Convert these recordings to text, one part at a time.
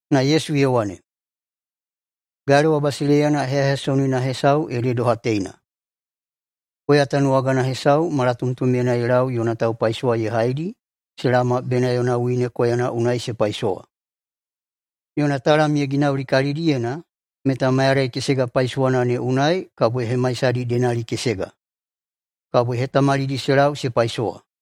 Na Yesu ye wane, “Galewa basileiyana heyaheyasonina hesau ede doha teina: Koya tanuwagana hesau malatomtomyena ye lau yona taupaisowa ye haidi se laoma bena yona wine koyana unai se paisowa. Yona talam ye ginauli kalidiyena meta mayadai kesega paisowana ne unai kabo ye hemaisadi denalikesega. Kabo ye hetamalidi se lau se paisowa.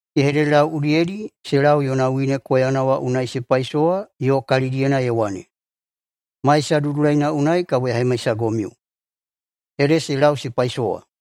Ye hededelau udiyedi se lau yona wine koyana wa unai se paisowa yo kalidiyena ye wane, ‘Maisa dudulaina unai kabo ya hemaisagomiu.’ Ede se lau se paisowa.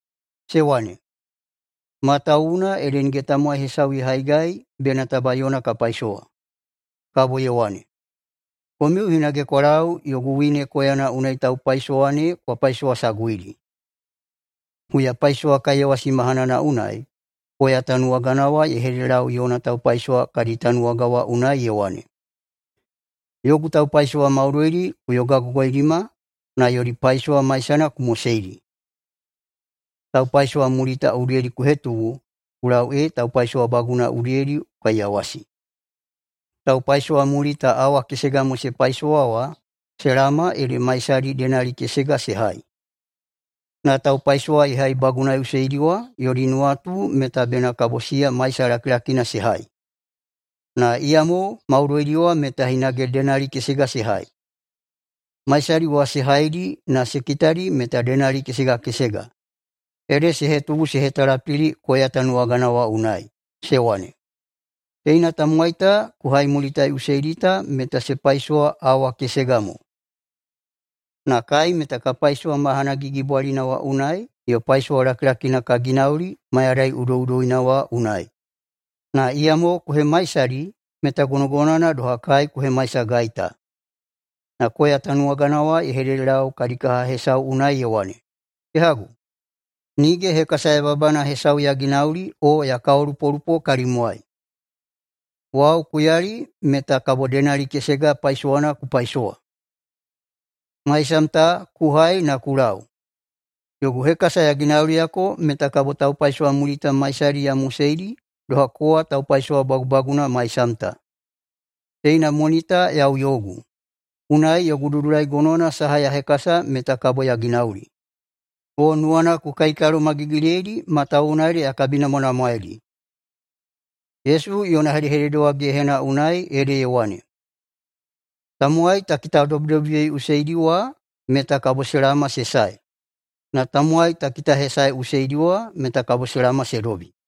Se wane, ‘Matawuwuna ede nige tamowai hesau ye haigai bena taba yona ka paisowa.’ Kabo ye wane, ‘Komiu hinage kwa lau yogu wine koyana unai taupaisowa ne kwa paisowasaguidi.’ Huyapaisowakaiyawasi mahanana unai koya tanuwagana wa ye hededelau yona taupaisowa kadi tanuwaga wa unai ye wane, ‘Yogu taupaisowa maudoidi ku yogagogoidima na yodi paisowa maisana ku moseidi. Taupaisowamulita udiyedi ku hetubu ku lau ee taupaisowabaguna udiyedi ku kaiyawasi.’ Taupaisowamulita awa kesega mo se paisowa wa se laoma ede maisadi denali kesega se hai. Na taupaisowa ye haibagunaiꞌuseidi wa yodi nuwatu meta bena kabo siya maisa lakilakina se hai, na iyamo maudoidi wa meta hinage denali kesega se hai. Maisadi wa se haidi na se kitadi meta denali kesega kesega ede se hetubu se hetalapili koya tanuwagana wa unai, se wane, ‘Teina tamowai ta ku haimulitaꞌuseidi ta meta se paisowa awa kesega mo, na kai meta ka paisowa mahana gigibwalina wa unai yo paisowa lakilakina ka ginauli mayadai udoꞌudoina wa unai, na iyamo ku hemaisadi meta gonogonowana doha kai ku hemaisagai ta.’ Na koya tanuwagana wa ye hededelau kadi kaha hesau unai ye wane, ‘Kehagu, nige hekasa yababana hesau ya ginauli o ya kaolupolupo kalimwai. Wau ku yali meta kabo denali kesega paisowana ku paisowa. Maisam ta ku hai na ku lau, yogu hekasa ya ginauliyako meta kabo taupaisowamulita maisadi ya moseidi doha kowa taupaisowa bagubagunana maisam ta. Teina moni ta yau yogu, unai yogu dudulai gonowana saha ya hekasa meta kabo ya ginauli. O nuwana ku kaikalomagigiliyeidi matawuwuna ede ya kabinamwanamwaeidi?’” [Yesu yona hedehedede wa gehena unai ede ye wane,] “Tamowai ta kitadobidobiyeiꞌuseidi wa meta kabo se laoma se sae, na tamowai ta kitahesaeꞌuseidi wa meta kabo se laoma se dobi.”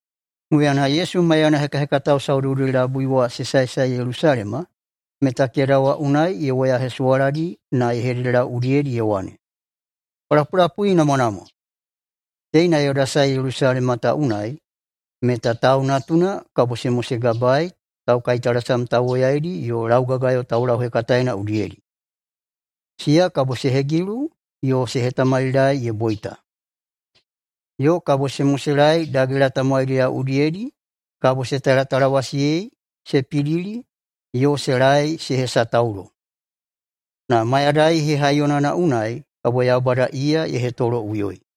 Huyana Yesu maiyana hekahekatao saudoudoi-labui wa se saesae Yelusalema meta keda wa unai ye woyahesuwaladi na ye hededelau udiyedi ye wane, “Kwa lapulapuinamwanamwa! Teina yoda sae Yelusalema ta unai meta Tau Natuna kabo se mosegabaei taukaitalasam tauwoyaidi yo laugagayo taulauhekataena udiyedi. Siya kabo se hegilu yo se hetamalilaei ye boita. Yo kabo se moselaei dagela tamowaidiyao udiyedi kabo se talatalawasiyei, se pidili yo se laei se hesataulo. Na mayadai hehaiyonana unai kabo Yaubada iya ye hetoloꞌuyoi.”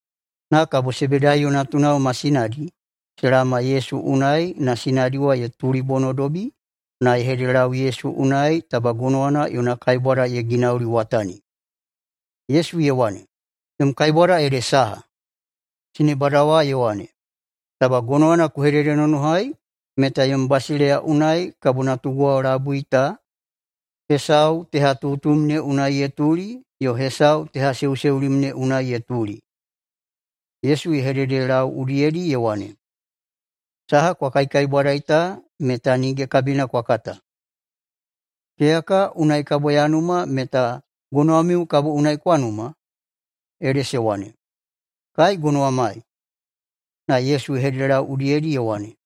Na kabo Sebedaiyo natunao ma sinadi se laoma Yesu unai na sinadi wa ye tulibonodobi na ye hededelau Yesu unai taba gonowana yona kaibwada ye ginauliwatani. Yesu ye wane, “Yom kaibwada ede saha?” Sinebada wa ye wane, “Taba gonowana ku hededenonohai meta yom basileiya unai kabo natuguwao labui ta hesau tehatutum ne unai ye tuli yo hesau tehaseuseulim ne unai ye tuli.” Yesu ye hededelau udiyedi ye wane, “Saha kwa kaikaibwadai ta meta nige kabina kwa kata! Keyaka unai kabo ya numa meta gonowamiu kabo unai kwa numa?” Ede se wane, “Kai gonowamai.” Na Yesu ye hededelau udiyedi ye wane,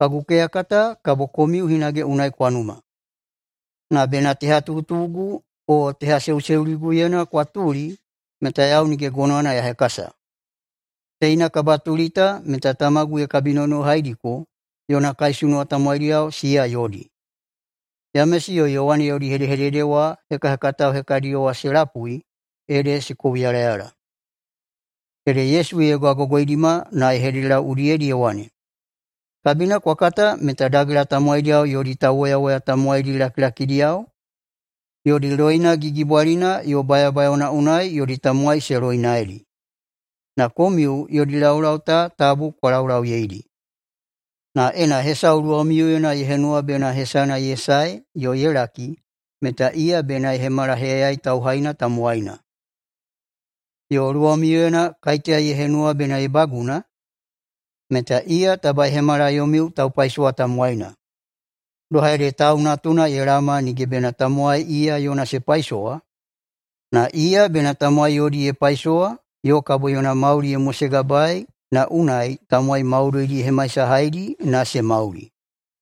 “Kagu keyaka ta kabo komiu hinage unai kwa numa, na bena tehatutugu o tehaseuseuliguyena kwa tuli meta yau nige gonowana ya hekasa. Teina kabatuli ta meta tamagu ye kabinonohaidiko yona kaisunuwa tamowaidiyao siya yodi.” Yamesi yo Yowane yodi hedehedede wa hekahekatao hekadiyo wa se lapui ede se kouyalayala. Ede Yesu ye yogagogoidima na ye hededelau udiyedi ye wane, “Kabina kwa kata meta dagela tamowaidiyao yodi tauwoyawoya tamowaidi lakilakidiyao yodi loina gigibwalina yo bayabayaona unai yodi tamowai se loinaedi. Na komiu yodi laulau ta tabu kwa laulauyeidi. Na ena hesau luwamiuyena ye henuwa bena hesana ye sae yo ye laki meta iya bena ye hemala heyayai tauhaina tamowaina. Yo luwamiuyena kaiteya ye henuwa bena ye baguna, meta iya taba ye hemala yomiu taupaisowa tamowaina. Doha ede Tau Natuna ye laoma nige bena tamowai iya yona se paisowa, na iya bena tamowai yodi ye paisowa yo kabo yona mauli ye mosegabaei na unai tamowai maudoidi ye hemaisahaidi na se mauli.”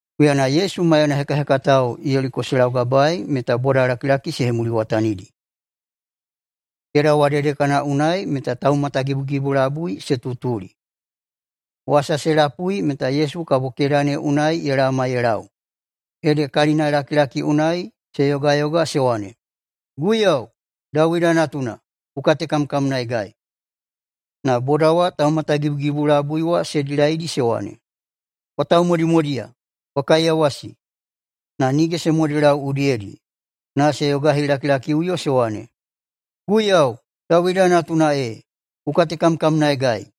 Huyana Yesu maiyana hekahekatao Yeliko se laugabaei meta bodalakilaki se hemuliwatanidi. Keda wa dedekana unai meta taumatagibugibu labui se tutuli. Wasa se lapui meta Yesu kabo keda ne unai ye laoma ye lau, ede kalinalakilaki unai se yogayoga se wane, “Guiyau, Dawida Natuna, ku katekamkamnaegai.” Na boda wa taumatagibugibu labui wa se dilaidi se wane, “Kwa taumodimodiya, kwa kaiyawasi!” Na nige se modelau udiyedi, na se yogahilakilakiꞌuyo se wane, “Guiyau, Dawida Natuna ee, ku katekamkamnaegai!”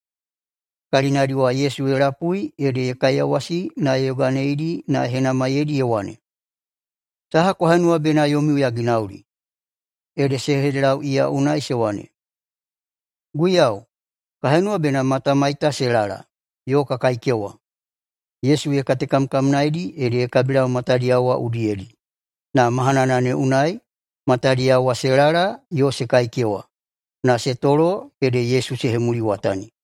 Kalinadi wa Yesu ye lapui ede ye kaiyawasi na ye yoganeidi na ye henamaiyeidi ye wane, “Saha kwa henuwa bena yomiu ya ginauli?” Ede se hededelau iya unai se wane, “Guiyau, ka henuwa bena matamai ta se lala yo ka kaikewa.” Yesu ye katekamkamnaedi ede ye kabilau matadiyao wa udiyedi, na mahanana ne unai matadiyao wa se lala yo se kaikewa, na se tolo ede Yesu se hemuliwatani.